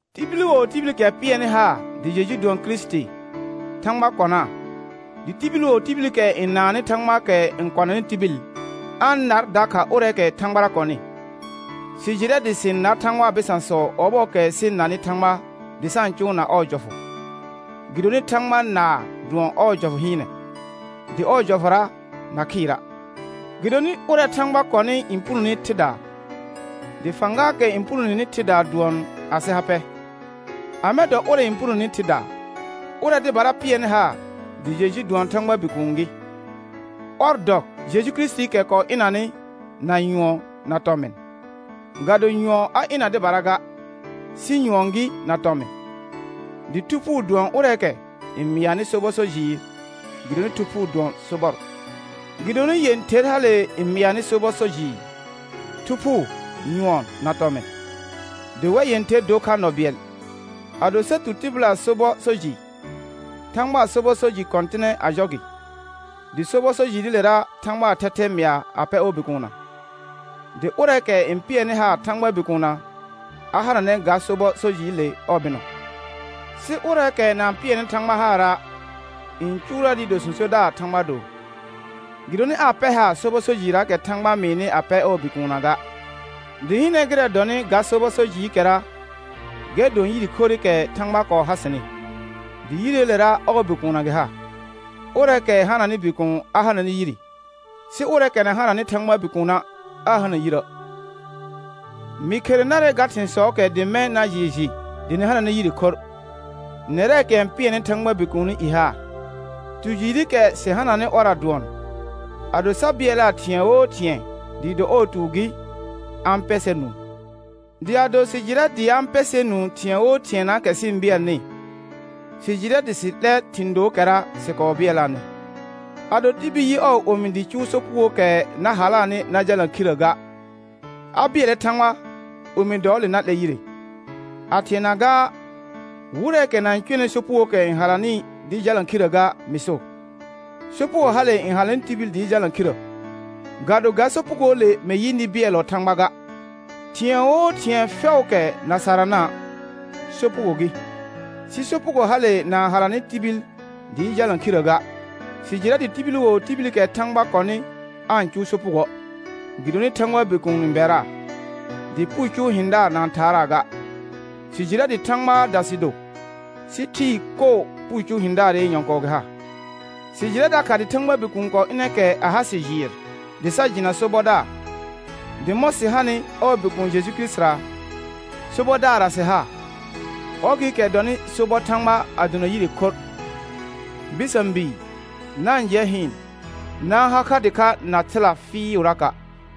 Tibil wo tibilikɛ pɩɛrnɩ haar dɩ Jeju dʋɔn Kirisiti, Thãgba kɔnaa; dɩ tibil wo tibilikɛ n naannɩ Thãgbaakɛ n kɔnanɩ tibil, a-n nar dakha ʋrɛɛkɛ Thãgbara kɔnɩ. Sɩ jɩrɛ dɩ sɩ-n nar Thãgbaa bɩsãsɔ ɔbɔɔkɛ sɩ-n nanɩ Thãgba dɩ sa-n cʋʋna ɔɔ jɔfʋ. Gɩdonɩ Thãgba naar dʋɔn ɔɔ jɔfʋ hɩɩnɛ, dɩ ɔɔ jɔfʋra na khɩɩra'. Gɩdonɩ ʋrɛ Thãgba kɔnɩ n punone thɩdaa; dɩ fãgaakɛ n punoneni thɩdaa dʋɔn asɩ ha pɛ. Amɛ dɔ ʋrɛ n punoneni thɩdaa? Ʋrɛ dɩbara pɩɛrnɩ haar dɩ Jeju dʋɔn Thãgbaa Bikuun gɩ. Ɔr dɔ Jeju Kirisitiikɛ kɔɔ ɩnanɩ na nyʋɔn na tɔmɩn, ga do nyʋɔn a ɩna dɩbara ga, sɩ nyʋɔn gɩ na tɔmɩn. Dɩ Thu Phuu dʋɔn ʋrɛɛkɛ n mɩanɩ sobɔ so jɩɩr, gɩdonɩ Thu Phuu dʋɔn sobɔr. Gɩdonɩ yẽther hale n mɩanɩ sobɔ so jɩɩr: Thu Phuu, nyʋɔn na tɔmɩn, dɩ wɛr yẽther dor kha nɔ bɩɛl. Ado sa tu tɩbɩlaa sobɔ so jɩ, Thãgbaa sobɔ so jɩ kɔ̃tɩnɛ a jɔ gɩ, dɩ sobɔ so jɩɩrɩlera Thãgbaa thɛthɛ mɩa a pɛ ɔɔ Bikuunna. Dɩ ʋrɛɛkɛ n pɩɛrnɩ haar Thãgbaa Bikuunna, a hananɛ ga sobɔ so jɩɩle ɔɔ bɩnɔ; sɩ ʋrɛɛkɛ na-n pɩɛrnɩ Thãgba haara', n cʋʋrɛ dɩɩ do sõsodaar Thãgba do, gɩdonɩ aa pɛr haar sobɔ so jɩɩrraakɛ Thãgba mɩɩnɩ a pɛr ɔɔ Bikuunna ga. Dɩ hɩnɛ gɩrɛ dɔnɩ ga sobɔ so jɩɩkɛra, gɛr dʋɔn yire khorrɩkɛ Thãgba kɔɔ ha sɩnɩ, dɩ yireelera ɔɔ Bikuunna gɩ ha. Ʋrɛɛkɛ hananɩ Bikuun a hananɛ yire, sɩ ʋrɛɛkɛ na hananɩ Thãgbaa Bikuuna', aa hana yirə'. Mɩ khere narɛ ga thɩ̃sɔɔkɛ dɩ mɛ̃ na jɩɩ jɩ dɩ nɩ hananɛ yire khorr, nɛrɛɛkɛ n pɩɛrnɩ Thãgbaa Bikuuni i haar. Tu jɩɩrɩkɛ sɩ hananɩ ɔrra dʋɔn, ado sa bɩɛlaa thɩ̃ɛ wo thɩ̃ɛ dɩɩ do ɔɔ tuur gɩ, a-n pɛ sɛr nũu. Dɩ ado sɩ jɩrɛ dɩ a-n pɛ sɛr nũu thɩ̃ɛ wo thɩɛnaakɛ sɩ-n bɩɛlnɩ, sɩ jɩrɛ dɩ sɩ 'lɛr thɩ̃ dookɛra sɩ kɔɔ bɩɛlaanɩ. Ado tibil yɩ ɔɔ omi dɩ cʋʋ sopugookɛ na halaanɩ na jalna khirrə ga, a bɩɛlnɛ Thãgba omi dɔɔle na 'lɛr yire. A thɩɛna gaa, wɩrɛɛkɛ na-n cʋɛnɩ sopugookɛ n halanɩ dɩɩ jalna khirrə ga mɩ so. Sopugo hale n halanɩ tibil dɩɩ jalna khirrə, ga do ga sopugoole mɩ yɩ nɩ bɩɛllɔ Thãgba ga. Thɩ̃ɛ wo thɩ̃ɛ fɛʋʋkɛ na sarana', sopugo gɩ, sɩ sopugo hale na-n halanɩ tibil dɩɩ jalna khirrə ga. Sɩ jɩrɛ dɩ tibil wo tibilikɛ Thãgba kɔnɩ aa-n cʋʋ sopugoə', gɩdonɩ Thãgbaa Bikuun n bɛraa, dɩ puu cʋʋ hɩ̃daar na-n thaaraa ga. Sɩ jɩrɛ dɩ Thãgbaada sɩ do, sɩ thɩɩ koo puu cʋʋ hɩ̃daarɩ nyɔ̃kɔɔ gɩ ha. Sɩ jɩrɛ dakha dɩ Thãgbaa Bikuun kɔɔ ɩnɛ kɛ a ha sɩ jɩɩr dɩ sa jɩna sobɔdaar; dɩ mɔ̃ sɩ hanɩ ɔɔ Bikuun Jeju Kirisitira, sobɔdaarra sɩ ha; ɔr gɩɩkɛ dɔnɩ sobɔ Thãgba a dona yire khorr. Bɩsã bii, na-n jɩɛ hɩɩn, na-n ha kha dɩkha na thɩla fɩɩʋraka'.